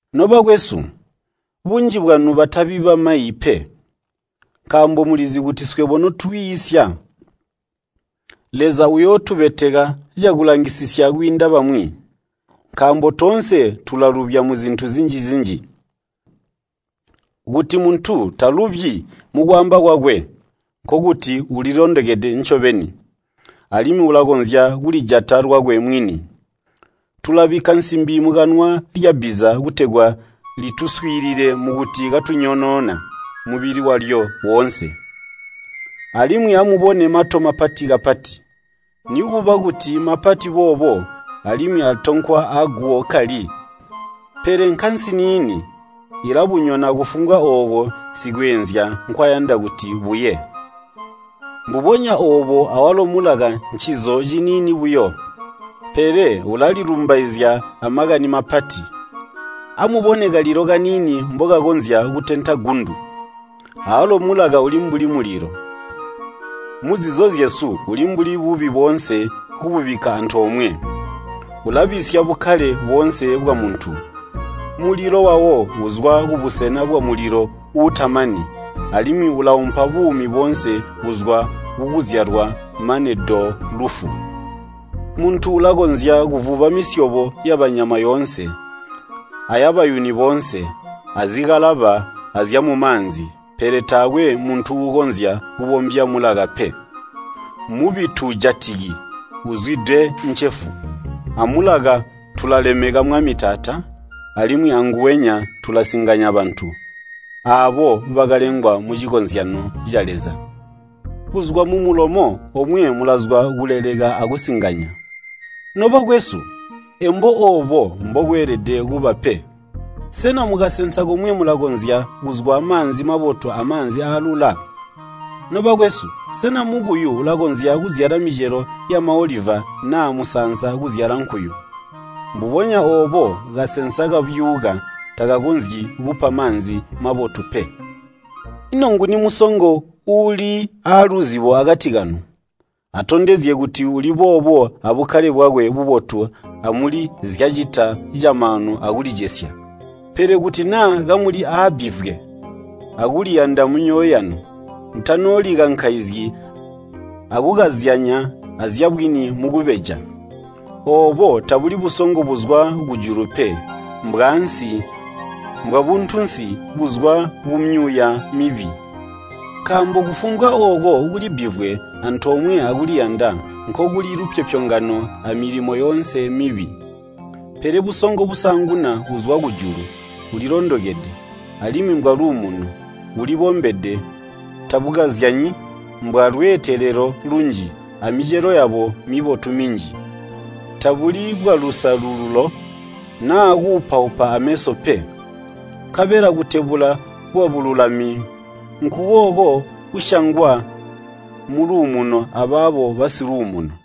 Nobakwesu, bunji bwanu batabi bamayi pe, nkaambo mulizi kuti swebo notwiisya, Leza uyootubeteka cakulangisisya kwiinda bamwi. Nkaambo toonse tulalubya muzintu zinji-zinji. Kuti muntu talubyi mukwaamba kwakwe, nkokuti ulilondokede ncobeni, alimwi ulakonzya kulijata lwakwe mwini. Tulabikka nsimbi mukanwa lyabbiza kutegwa lituswiilile mukuti katunyonoona mubili walyo woonse. Alimwi amubone mato mapati kapati, nikuba kuti mapati boobo alimwi atonkwa aguwo kkali, pele nkasi niini ilabunyona kufumbwa ooko sikweenzya nkwayanda kuti buye. Mbubonya oobo awalo mulaka ncizo ciniini buyo, pele ulalilumbaizya amakani mapati. Amubone kalilo kaniini mbokakonzya kutenta gundu. Awalo mulaka uli mbuli mulilo. Muzizo zyesu uli mbuli bubi boonse kububikka antoomwe. Ulabisya bukkale boonse bwamuntu. Mulilo wawo uzwa kubusena bwamulilo uutamani, alimwi ulaumpa buumi boonse kuzwa kukuzyalwa mane do lufu. Muntu ulakonzya kuvuba misyobo yabanyama yoonse, ayabayuni boonse, azikalaba, azyamumaanzi pele taakwe muntu uukonzya kubombya mulaka pe. Mmubi tuujatiki, uzwide ncefu. Amulaka tulalemeka Mwami Taata, alimwi anguwenya tulasinganya bantu, aabo bakalengwa mucikozyanyo ca Leza. Kuzwa mumulomo omwe mulazwa kuleleka akusinganya. Nobakwesu, embo oobo mbokweelede kuba pe. Sena mukasensa komwe mulakonzya kuzwa maanzi mabotu amaanzi aalula? Nobakwesu, sena mukuyu ulakonzya kuzyala micelo yamaoliva naa musaansa kuzyala nkuyu? Mbubonya oobo kasensa kabyuuka takakonzyi kupa maanzi mabotu pe. Ino nguni musongo uuli aaluzibo akati kanu? Atondezye kuti uli boobo abukkale bwakwe bubotu amuli nzyacita camaanu akulicesya. Pele kuti naa kamuli aabbivwe akuliyanda mumyoyo yanu, mutanoolikankaizyi akukazyanya azyabwini mukubeja. Oobo tabuli busongo buzwa kujulu pe, mbwaansi, mbwabuntunsi buzwa kumyuuya mibi. Nkaambo kufumbwa ooko kuli bbivwe antoomwe akuliyanda, nkokuli lupyopyongano amilimo yoonse mibi. Pele busongo busaanguna buzwa kujulu bulilondokede, alimwi mbwaluumuno, bulibombede, tabukazyanyi, mbwalweetelelo lunji, amicelo yabo mibotu minji. Tabuli bwalusalululo naa kuupaupa aameso pe. Nkabela kutebula kwabululami nkukooko kusyangwa muluumuno abaabo basiluumuno.